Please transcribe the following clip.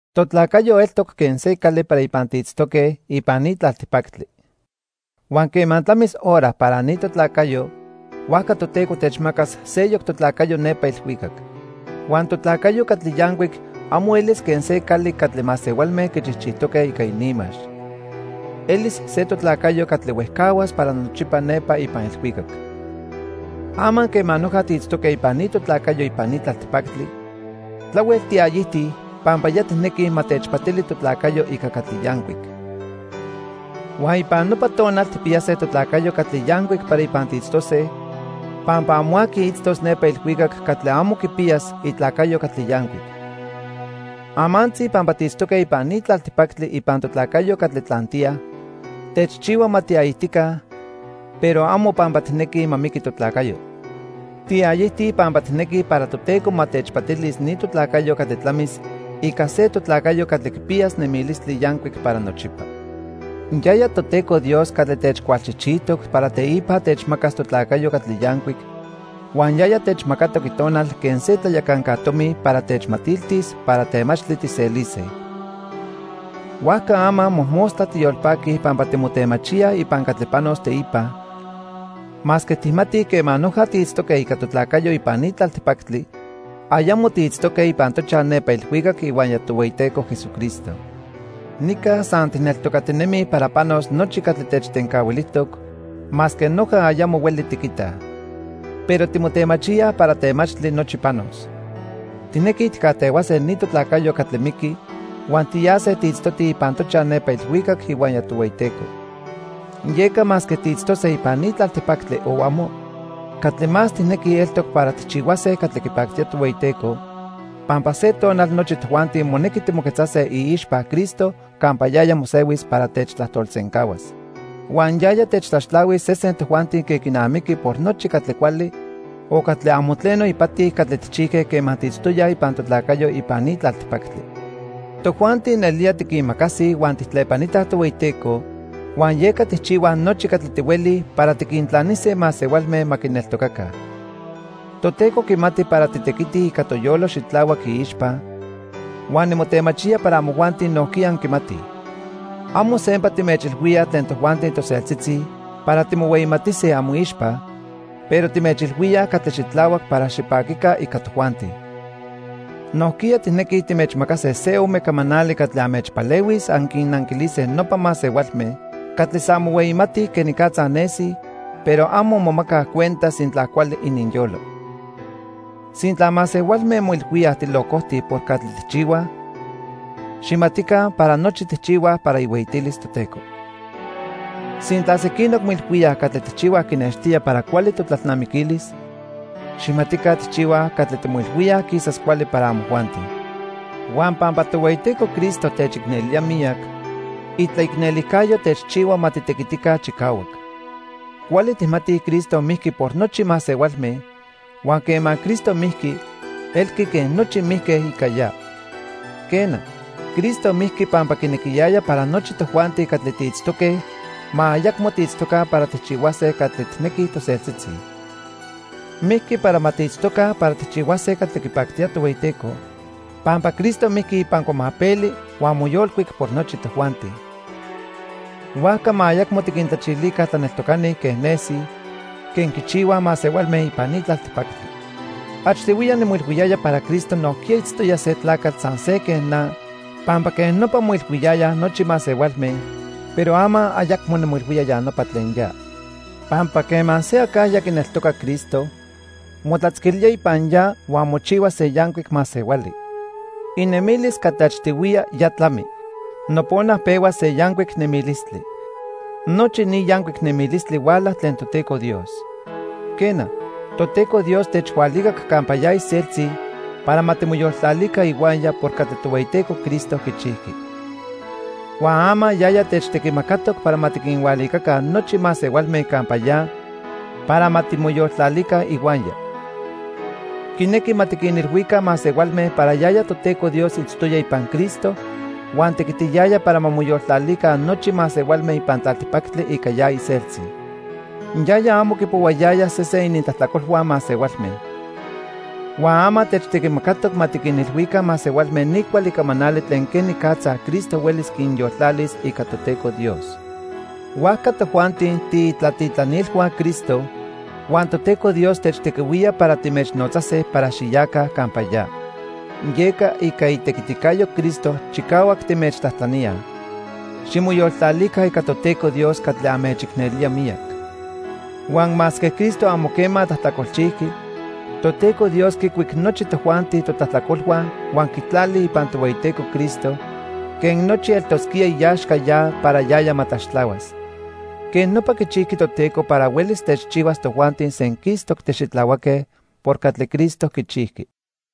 Totlacayo eltoc quen se cali para ipan tiitztoque ipan ni tlaltipactli. Huan quema tlamis hora para ni totlacayo, huajca Toteco techmacas seyoc totlacayo nepa ilhuicac. Huan totlacayo catli yancuic amo elis quen se cali catli masehualme quichijchijtoque ica ininmax. Elis se totlacayo catli huejcahuas para nochipa nepa ipan ilhuicac. Ama quema noja tiitztoque ipan ni totlacayo ipan ni tlaltipactli, tlahuel tiayijtij pampa ya tijnequij ma techpatili totlacayo ica catli yancuic. Huan ipan nopa tonal tijpiyase totlacayo catli yancuic para ipan tiitztose, pampa amo aqui itztos nepa ilhuicac catli amo quipiyas itlacayo catli yancuic. Amantzi pampa tiitztoque ipan ni tlaltipactli ipan totlacayo catli tlantiya, techchihua ma tiayijtica, pero amo pampa tijnequij ma miqui totlacayo. Tiayijtij pampa tijnequij para Toteco ma techpatilis ni totlacayo catli tlamis ica se totlacayo catli quipiyas nemilistli yancuic para nochipa. Yaya Toteco Dios catli techcualchijchijtoc para teipa techmacas totlacayo catli yancuic, huan yaya techmacatoc Itonal quen se tlayacanca tomi para techmatiltis para temachtli tijselise. Huajca ama mojmostla tiyolpaquij pampa timotemachíaj ipan catli panos teipa, masque tijmatij quema noja tiitztoque ica totlacayo ipan ni tlaltipactli, ayamo tiitztoque ipan tochaj nepa ilhuicac ihuaya Tohueyiteco Jesucristo. Nica san tijneltocatinemij para panos nochi catli techtencahuilijtoc, masque noja ayamo hueli tiquitaj. Pero timotemachíaj para temachtli nochi panos. Tijnequij tijcajtehuase ni totlacayo catli miqui huan tiyase tiitztotij ipan tochaj nepa ilhuicac ihuaya Tohueyiteco. Yeca masque tiitztose ipan ni tlaltipactli o amo, catli más tijnequij eltoc para tijchihuase catli quipactía Tohueyiteco, pampa se tonal nochi tojuanti monequi timoquetzase iixpa Cristo campa yaya mosehuis para techtlajtolsencahuas. Huan yaya techtlaxtlahuis sesen tojuanti quen quinamiqui por nochi catli cuali o catli amo tleno ipati catli tijchijque quema tiitztoyaj ipan totlacayo ipan ni tlaltipactli. Tojuanti nelía tiquimacasij huan tijtlepanitaj Tohueyiteco, huan yeca tijchihuaj nochi catli tihuelij para tiquintlanise masehualme ma quineltocaca. Toteco quimati para titequitij ica toyolo xitlahuac iixpa, huan nimotemachía para amojuanti nojquiya anquimatij. Amo sempa timechilhuíaj tlen tojuanti toseltzitzi para timohueyimatise amoixpa, pero timechilhuíaj catli xitlahuac para xipaquica ica tojuanti. Nojquiya tijnequij timechmacase se ome camanali catli anmechpalehuis anquinnanquilise nopa masehualme catli san mohueyimatij quenicatza nesij, pero amo momacaj cuenta sintla cuali ininyolo. Sintla masehualme moilhuíaj tilocojtij por catli tijchihuaj, xijmatica para nochi tijchihuaj para ihueyitilis Toteco. Sintla sequinoc moilhuíaj catli tijchihuaj quinextía para cuali totlalnamiquilis, xijmatica tijchihuaj catli timoilhuíaj quisas cuali para amojuanti. Huan pampa Tohueyiteco Cristo techicnelía miyac, itlaicnelijcayo techchihua ma titequitica chicahuac. Cuali tijmatij Cristo mijqui por nochi masehualme, huan quema Cristo mijqui, elqui quen nochi mijque ica ya. Quena, Cristo mijqui pampa quinequiyaya para nochi tojuanti catli tiitztoque ma ayacmo tiitztoca para tijchihuase catli tijnequij toseltzitzi. Mijqui para ma tiitztoca para tijchihuase catli quipactía Tohueyiteco pampa Cristo mijqui ipan cuamapeli huan moyolcuic por nochi tojuanti. Huajca ma ayacmo tiquintlachilica tlaneltocani quen nesij, quen quichihuaj masehualme ipan ni tlaltipactli. Achtihuiya nimoilhuiyaya para Cristo nojquiya itztoya se tlacatl san se quen na pampa quej nopa moilhuiyayaj nochi masehualme, pero ama ayacmo nimoilhuía ya nopa tlen ya. Pampa quema se acajya quineltoca Cristo, motlatzquilía ipan ya huan mochihua se yancuic masehuali. Inemilis catli achtihuiya ya tlami. Nopona pehua se yancuic nemilistli. Nochi ni yancuic nemilistli huala tlen Toteco Dios. Quena, Toteco Dios techhualicac campa ya iseltzi para ma timoyoltlalica ihuaya por catli Tohueyiteco Cristo quichijqui. Huan ama yaya techtequimacatoc para ma tiquinhualicaca nochi masehualme campa ya para ma timoyoltlalica ihuaya. Quinequi ma tiquinilhuica masehualme para yaya Toteco Dios itztoya ipan Cristo huan tequitiyaya para ma moyoltlalica nochi masehualme ipan tlaltipactli ica ya iseltzi. Yaya amo quipohuayaya sesen inintlajtlacolhua masehualme. Huan ama techtequimacatoc ma tiquinilhuica masehualme ni cuali camanali tlen quenicatza Cristo huelis quinyoltlalis ica Toteco Dios. Huajca tojuanti tiitlatitlanilhua Cristo, huan Toteco Dios techtequihuía para timechnotzase para xiyaca campa ya. Yeca ica itequiticayo Cristo chicahuac timechtlajtlaníaj, ximoyoltlalica ica Toteco Dios catli anmechicnelía miyac. Huan masque Cristo amo quema tlajtlacolchijqui, Toteco Dios quicuic nochi tojuanti totlajtlacolhua huan quitlali ipan Tohueyiteco Cristo quen nochi eltosquía iaxca ya para yaya ma tlaxtlahuas. Quej nopa quichijqui Toteco para huelis techchihuas tojuanti senquistoc tixitlahuaque por catli Cristo quichijqui.